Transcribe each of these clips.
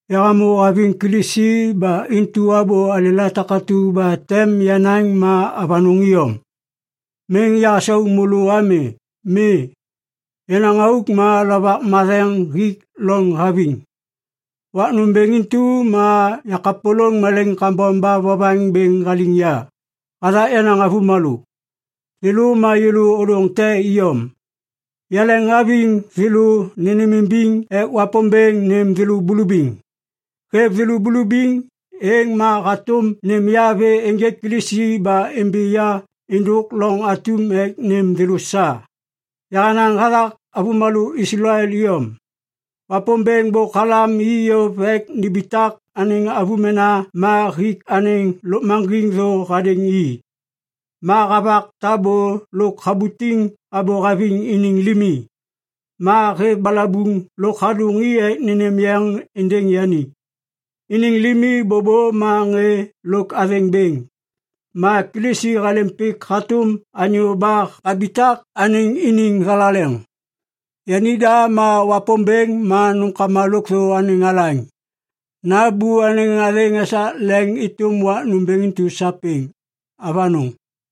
Yahamô haviŋ Kilisi ba intu abô alêla takatu ba tem yanaŋ ma avanôŋ iyom. Miŋ yahasau môlô ami. Mi, yenaŋ auk ma Lovak Matheŋ hik loŋ haviŋ. Wak nômbêŋ intu ma yakapôlôŋ malaiŋ kambom ba vovaŋ bêŋ haliŋ ya hathak yenaŋ avômalô, thêlô ma yêlô ôdôŋ te iyom. Yaleŋhaviŋ thêlô nênêmimbiŋ ek Wapômbêŋ nêm thêlô bulubiŋ. Hêv thêlô bulubiŋ, êŋ ma hatôm nêm ya vê ênjêk Kilisi ba imbi ya êndôk loŋ atum ek nêm thêlô sa. Yahanaŋ hathak avômalô Islael iyom. Wapômbêŋ bôk halam i yôv ek nimbitak anêŋ avômena ma hik anêŋ lôkmaŋgiŋ thô hadêŋ i. Ma havak tabô lôk habutiŋ abô haviŋ iniŋ limi. Ma hêv balabuŋ lôk hadôŋ i ek nênêm yeŋ êndêŋ yani. Iniŋ limi bôbô ma ŋê lôk athêŋ bêŋ. Ma Kilisi halêm pik hatôm anyô ba habitak anêŋ iniŋ thalaleŋ. Yanida ma Wapômbêŋ ma nômkama lôkthô anêŋ alaŋ. Nambô anêŋ athêŋ esak leŋ êtôm wak nômbêŋ intu sapêŋ. Avanôŋ.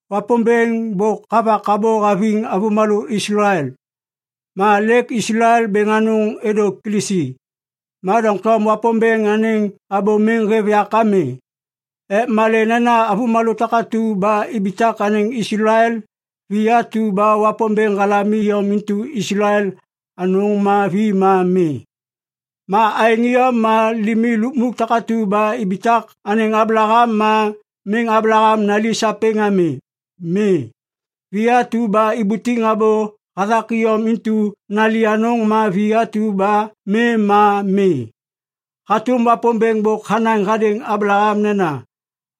Wapômbêŋ bôk havak abô haviŋ avômalô Islael. Ma lêk Islael bêŋ anôŋ êdô Kilisi, ma doŋtom Wapômbêŋ anêŋ abô miŋ hêv yak ami. Ek malê nena avômalô takatu ba ibitak anêŋ Islael, vi atu ba Wapômbêŋ halam iyom intu Islael anôŋ ma vi ma mi. Ma aêŋ iyom ma limi lukmuk takatu ba ibitak anêŋ Ablaham ma miŋ Ablaham nali sapêŋ ami. Mi, vi atu ba ibutiŋ abô hathak iyom intu nali anôŋ ma vi atu ba mi ma mi. Hatôm Wapômbêŋ bôk hanaŋ hadêŋ Ablaham nena,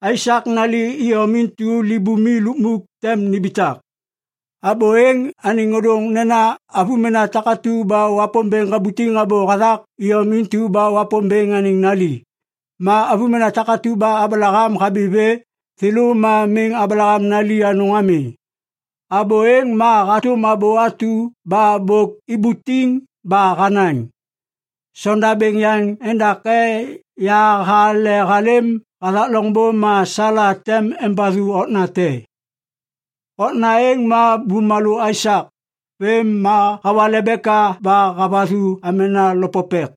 “Aisak nali iyom intu libumi lukmuk tem nimbitak.” Abô êŋ anêŋ ôdôŋ nena avômena takatu ba Wapômbêŋ habutiŋ abô hathak iyom intu ba Wapômbêŋ anêŋ nali. Ma avômena takatu ba Ablaham habi vê, thêlô ma miŋ Ablaham nali anôŋ ami. Abô êŋ ma hatôm abô atu ba bôk ibutiŋ ba hanaŋ, “Sondabêŋ yaŋ endake yahale halêm hathak loŋbô ma Sala tem embathu okna te.” Okna êŋ ma bumalô Aisak. Vêm ma hawa Lebeka ba havathu amena lopopek.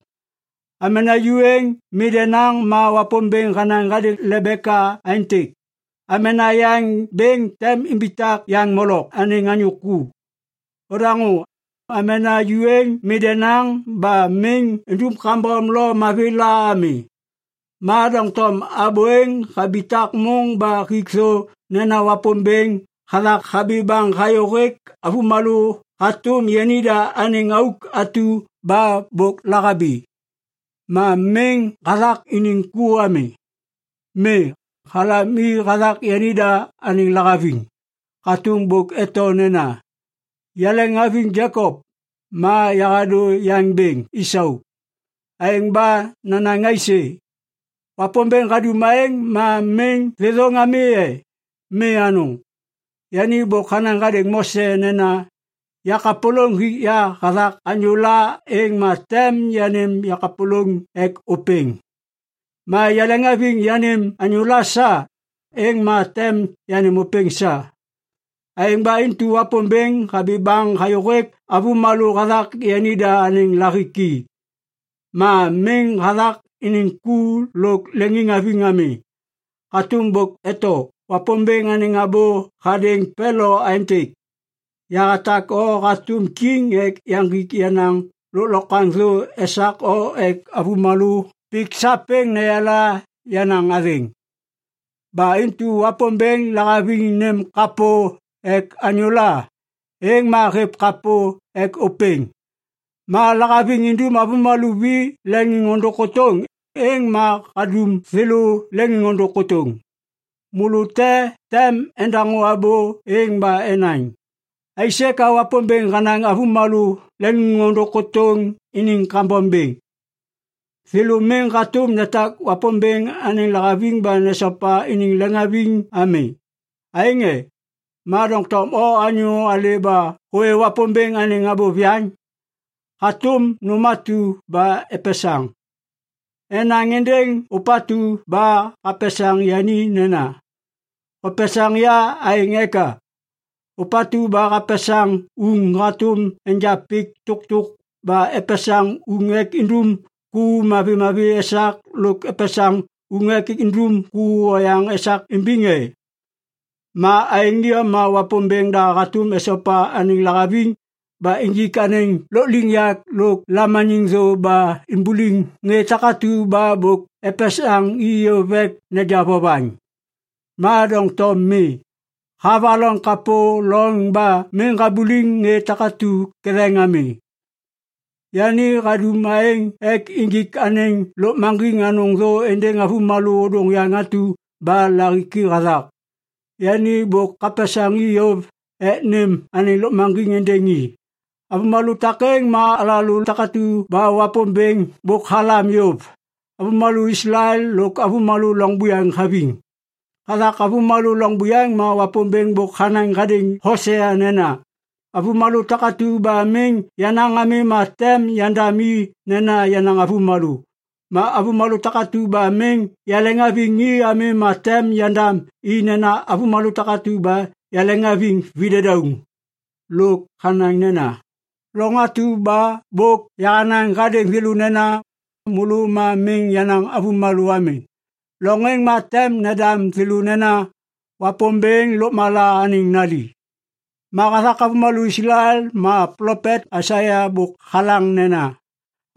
Amena ju êŋ mi denaŋ ma Wapômbêŋ hanaŋ hadêŋ Lebeka aêntêk, “Amena yaŋ bêŋ tem imbitak yaŋ molok anêŋ anyô ku.” Odaŋô! Amena ju êŋ mi denaŋ ba miŋ idum kambom lo mavi la ami. Ma doŋtom abô êŋ habitak môŋ ba hik thô nena Wapômbêŋ hathak habi baŋ hayôhêk avômalô hatôm yanida anêŋ auk atu ba bôk lahabi. Ma miŋ hathak iniŋ ku ami. Mi, halam i hathak yanida anêŋ lahaviŋ. Hatôm bôk eto nena, “Yaleŋhaviŋ Jekop, ma yahadô yaŋ bêŋ Isau”. Aêŋ ba nanaŋ aisê? Wapômbêŋ hadum aêŋ ma miŋ thêthôŋ ami e? Mi anôŋ! Yani bôk hanaŋ hadêŋ Mose nena, “Yakapôlôŋ hik ya hathak anyôla, êŋ ma tem yanêm yakapôlôŋ ek ôpêŋ. Ma yaleŋhaviŋ yanêm anyôla sa, êŋ ma tem yanêm ôpêŋ sa.” Aêŋ ba intu Wapômbêŋ habi baŋ hayôhêk avômalô hathak yanida anêŋ lahiki. Ma miŋ hathak iniŋ ku lôk leŋiŋhaviŋ ami. Hatôm bôk eto Wapômbêŋ anêŋ abô hadêŋ Pelo aêntêk, “Yahatak o hatôm kiŋ ek yaŋgik yenaŋ lôklokwaŋ thô esak o ek avômalô pik sapêŋ neyala yenaŋ athêŋ.” Ba intu Wapômbêŋ lahaviŋ nêm kapô ek anyôla, êŋ ma hêv kapô ek ôpêŋ. Ma lahaviŋ indum avômalô vi leŋôndôŋ kôtôŋ, êŋ ma hadum thêlô leŋôndôŋ kôtôŋ. Môlô te tem endaŋô abô êŋ ba enaŋ, “Aisê ka Wapômbêŋ hanaŋ avômalô leŋôndôŋ kôtôŋ iniŋ kambom bêŋ? Thêlô miŋ hatôm netak Wapômbêŋ anêŋ lahaviŋ ba nesopa iniŋ leŋiŋhaviŋ ami, aêŋ e?” Ma doŋtom o anyô alê ba hôwê Wapômbêŋ anêŋ abô viyaŋ? Hatôm nôm atu ba epesaŋ, enaŋ êndêŋ ôpatu ba hapesaŋ yani nena, “Hopesaŋ ya aêŋ eka?” Ôpatu ba hapesaŋ uŋ hatôm enja pik tôktôk ba epesaŋ uŋ ek indum ku mavimavi esak lôk epesaŋ uŋ ek indum ku oyaŋ esak imbiŋ e? Ma aêŋ iyom ma Wapômbêŋ da hatôm esopa anêŋ lahaviŋ ba injik anêŋ lôkliŋyak lôk lamaniŋ thô ba imbuliŋ ŋê takatu ba bôk epesaŋ i yôv ek neja vovaŋ. Ma doŋtom mi, havaloŋ kapô loŋ ba miŋ habuliŋ ŋê takêŋ ketheŋ ami. Yani hadum aêŋ ek injik anêŋ lôkmaŋgiŋ anôŋ thô êndêŋ avômalô ôdôŋ yaŋ atu ba lahiki hathak. Yani bôk hapesaŋ i yôv ek nêm anêŋ lôkmaŋgiŋ êndêŋ i. Avômalô takêŋ ma alalô takatu ba Wapômbêŋ bôk halam yôv, avômalô Islael lôk avômalô loŋ buyaŋ haviŋ. Hathak avômalô loŋ buyaŋ ma Wapômbêŋ bôk hanaŋ hadêŋ Hosea nena, “Avômalô takatu ba miŋ yenaŋ ami ma tem yandam i nena ‘yenaŋ avômalô’. Ma avômalô takatu ba miŋ yaleŋhaviŋ i ami ma tem yandam i nena ‘avômalô takatu ba yaleŋhaviŋ videdauŋ.’” Lôk hanaŋ nena, “Loŋ atu ba bôk yahanaŋ hadêŋ thêlô nena, ‘Môlô ma miŋ yenaŋ avômalô ami’, loŋ êŋ ma tem nendam thêlô nena, ‘Wapômbêŋ Lôkmala anêŋ nali.’” Ma hathak avômalô Islael ma plopet Aisaia bôk halaŋ nena,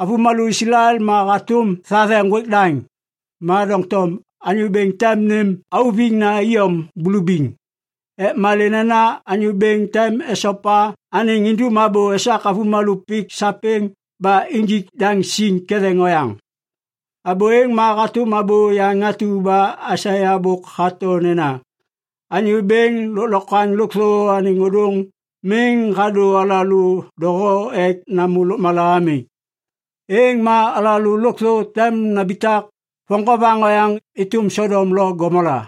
“Avômalô Islael ma hatôm thathe ŋgwêk daŋ, ma doŋtom Anyô Bêŋ tem nêm auviŋna iyom bulubiŋ. Ek malê nena Anyô Bêŋ tem esopa anêŋ indum abô esak avômalô pik sapêŋ ba injik daŋ siŋ ketheŋ oyaŋ.” Abô êŋ ma hatôm abô yaŋ atu ba Aisaia bôk hato nena, “Anyô Bêŋ Lôklokwaŋ Lôkthô Anêŋ Ôdôŋ miŋ hadô alalô doho ek namô lôkmala ami, êŋ ma alalô lôkthô tem nambitak voŋgovaŋ oyaŋ êtôm Sodom lo Gomola.”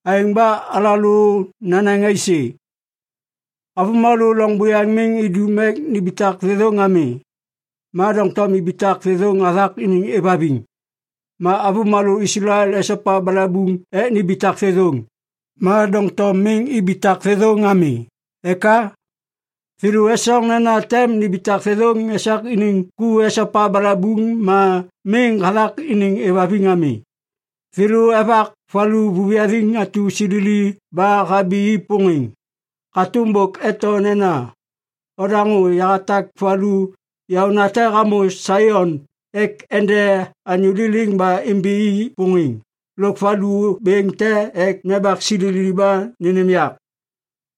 Aêŋ ba alalô nanaŋ aisê? Avômalô loŋ buyaŋ miŋ idum ek nimbitak thêthôŋ ami, ma doŋtom ibitak thêthôŋ hathak iniŋ êvhaviŋ. Ma avômalô Islael esopa balabuŋ ek nimbitak thêthôŋ, ma doŋtom miŋ ibitak thêthôŋ ami. Eka? Thêlô esoŋ nena tem nimbitak thêthôŋ esak iniŋ ku esopa balabuŋ ma miŋ hathak iniŋ êvhaviŋ ami. Thêlô evak valu vuviyathiŋ atu silili ba habi i pôŋêŋ. Hatôm bôk eto nena, “Odaŋô! Yahatak valu yaônate hamô Saion ek ende anyô liliŋ ba imbi i pôŋêŋ lôk valu bêŋ te ek nembak silili ba nênêm yak.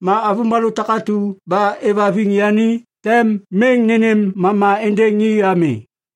Ma avômalô takatu ba êvhaviŋ yani tem miŋ nênêm mama êndêŋ i ami.”